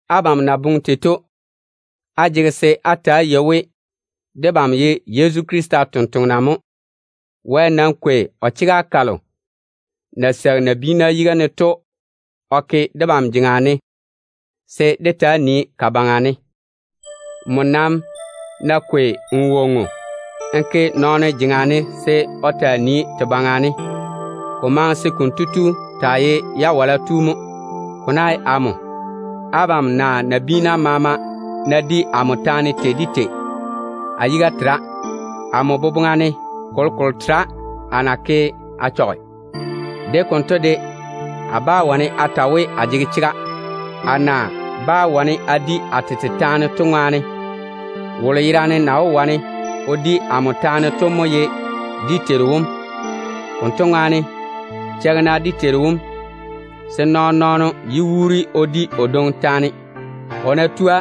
Abam na boŋe tei to, á jege se á ta‑á yei we debam ye Yezu Krista tontoŋena mo. Wɛ nam kwei o chega kalo ya na seigi nabiina yiga ne to o ke debam jeŋa ne se dé taa nii ka baŋa ne. Nmo nam ná kwei n wonnu n ke nɔɔno jeŋa ne se o taa nii te baŋa ne, ko maŋe se konto tu taa ye jawala tu mo. Ko ná ye amo, abam naa nabiina maama ná di amo taane tei de tei, a yiga tera. Amo boboŋa ne, kolokolo tera a na ke a chɔge. De konto de, a bá wane a ta we a yɔɔre a jege chega, a na bá wane a bore a tete bora to ŋwaane. Wolo yerane na wó bore amo bora to mo ye dé Teiru wom. Konto ŋwaane, cheigi-na dé Teiru wom, se nɔɔn-nɔɔno yé wuuri o di o dwoŋi taane. O ná tua,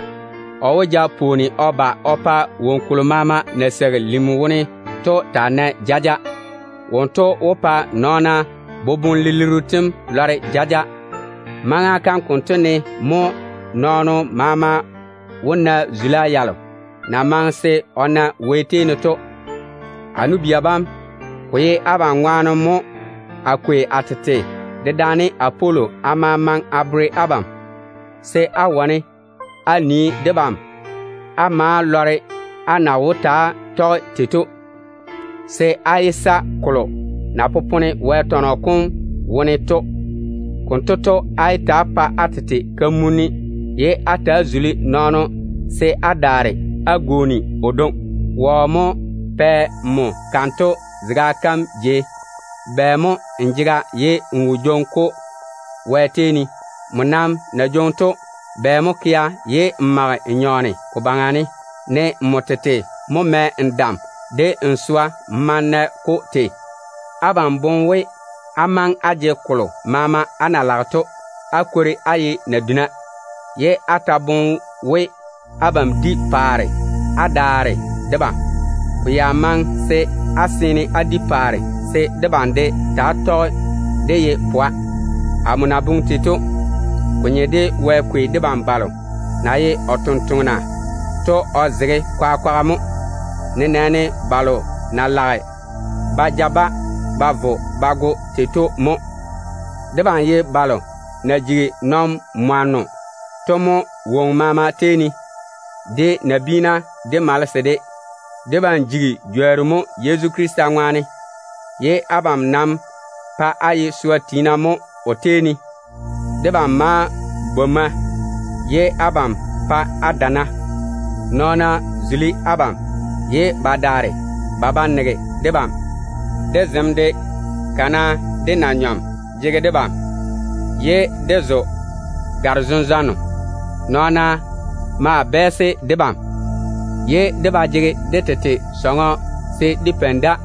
o wó ja pwooni o ba o pa woŋo kolo maama na seigi lim wone to taa nae jaja. Wonto wó pa nɔɔna boboŋ-lilirru tem lɔre jaja. Maŋa kam konto ne mo nɔɔno maama wó na zula yalo na maŋe se o na Wɛ tei ne to. A nu-bia bam, ko ye abam ŋwaane mo a kwei a tete dedaane Apolo a ma maŋe a bere abam, se á wane á nii debam á ma lɔre á na wó ta‑á tɔge tei to, se á yé sa chwoŋa de kolo na popone Wɛ tɔnɔ kom wone to. Konto to, nam yé bere-na á tete kamunim se á zuli nɔɔno ye á daare á gwooni o dwoŋi. Ko ná ye nmo, wɔ mo pɛ‑m kanto zega kam jei? Bɛ mo n jega ye n wo jwoŋi-ko Wɛ tei ne? Nmo nam na jwoŋi to, bɛ mo kea ye n mage n nyɔɔne ko baŋa ne, ne nmo tete mo mɛ n dam de n swa n ma n na-ko tei? Abam boŋe we, á maŋe á jege kolo maama á na lage to, á kwori á ye naduna, ye á ta boŋe we abam di paare á daare debam. Ko ya maŋe se á seene á di paare, se debam de taa tɔge dé ye pwa. Amo na boŋe tei to, ko nye de Wɛ kwei debam balo na ye o totoŋa nakwa to o zege kwaga kwaga mo, nenɛɛne ba na jaane balo ba vei se ba go to mo. Debam ye balo na jigi nɔn-mwanno to mo woŋo maama tei ne, de nabiina de malese de tei ne. Debam jigi nɔn-jworru mo Yezu Krista ŋwaane, ye abam pa á ye swa tiina mo o tei ne. Debam maa bwomma, ye abam pae á dana. Nɔɔna zuli abam, ye ba daare ba ba nege debam. De zem de, kana de na-nyɔm jege debam, ye dé zo gare-zenzwanno. Nɔɔna maa bɛɛse debam, ye dé ba jege dé tete diga se dé peini da.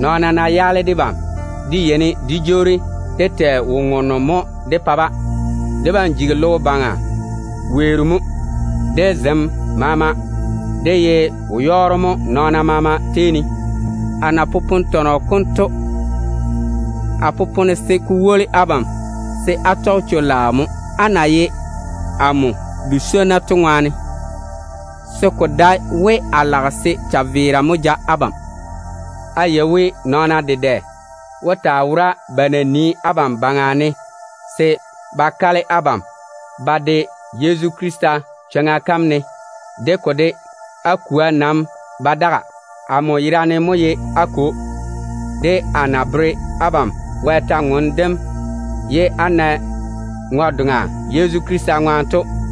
Nɔɔna ná yaale debam, dé yeini dé jwoori dé tɛ wo-ŋonno mo de-ba. Dé jigi logo baŋa weero mo. De zem maama, dé ye wo-yɔɔro mo nɔɔno maama tei ne. Amo na popone kolo to, a popone se ko woli abam se á tɔge chwo-laao mo, á na ye amo bu-swonnu to ŋwaane, se ko dae we a lage se chaveera mo ja abam. A yei we nɔɔna morro dedɛ mo wó taa wora ba na nii abam baŋa ne se ba kale abam ba de Yezu Krista chwoŋa kam ne. De ko de, á kwoa nam ba daga. Amo yerane mo ye á kwo, de amo na tɔge Wɛ kwor-ywoŋa kam baŋa ne a pa á na ŋwe-doŋa Yezu Krista ŋwaane to.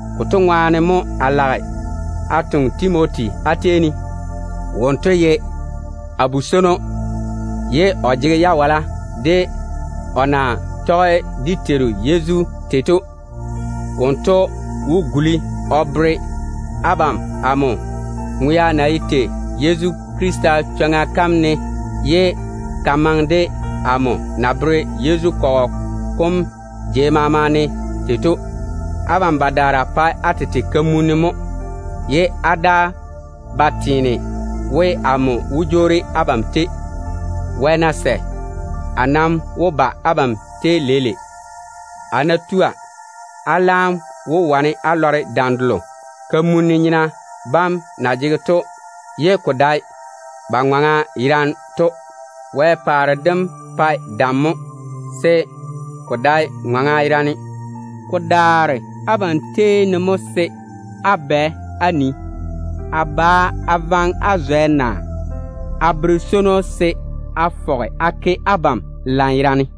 Konto ŋwaane mo a lage a toŋe Timoti á tei ne. Wonto ye a bu-swono, ye o jege jawala de o na tɔge dé Teiru Yezu tei to. Wonto wó guli o bere abam amo na yeini a tɔge Yezu Krista chwoŋa kam tei to, ne ko na maŋe de chega kalo amo na bere Yezu kɔgɔ kom jei maama ne tei to. Abam badaara pae á tete kamunni mo, ye á daa ba teene we amo wó jwoori abam tei. Wɛ ná sɛ, a nam wó ba abam tei leile. A ná tua, a laam wó wane a lɔre dam delo kamun-nyena bam na seene ba jega, ye ko dae ba ŋɔŋa yerane to. Wɛ paare dem pae dam mo, se ko dae ni-ŋɔŋa yerane. Ko daare abam tei ne mo se á bwɛ á nii, a ba a vaŋe á zwɛ, naa a bere swono se a fɔge a ke abam lanyerane?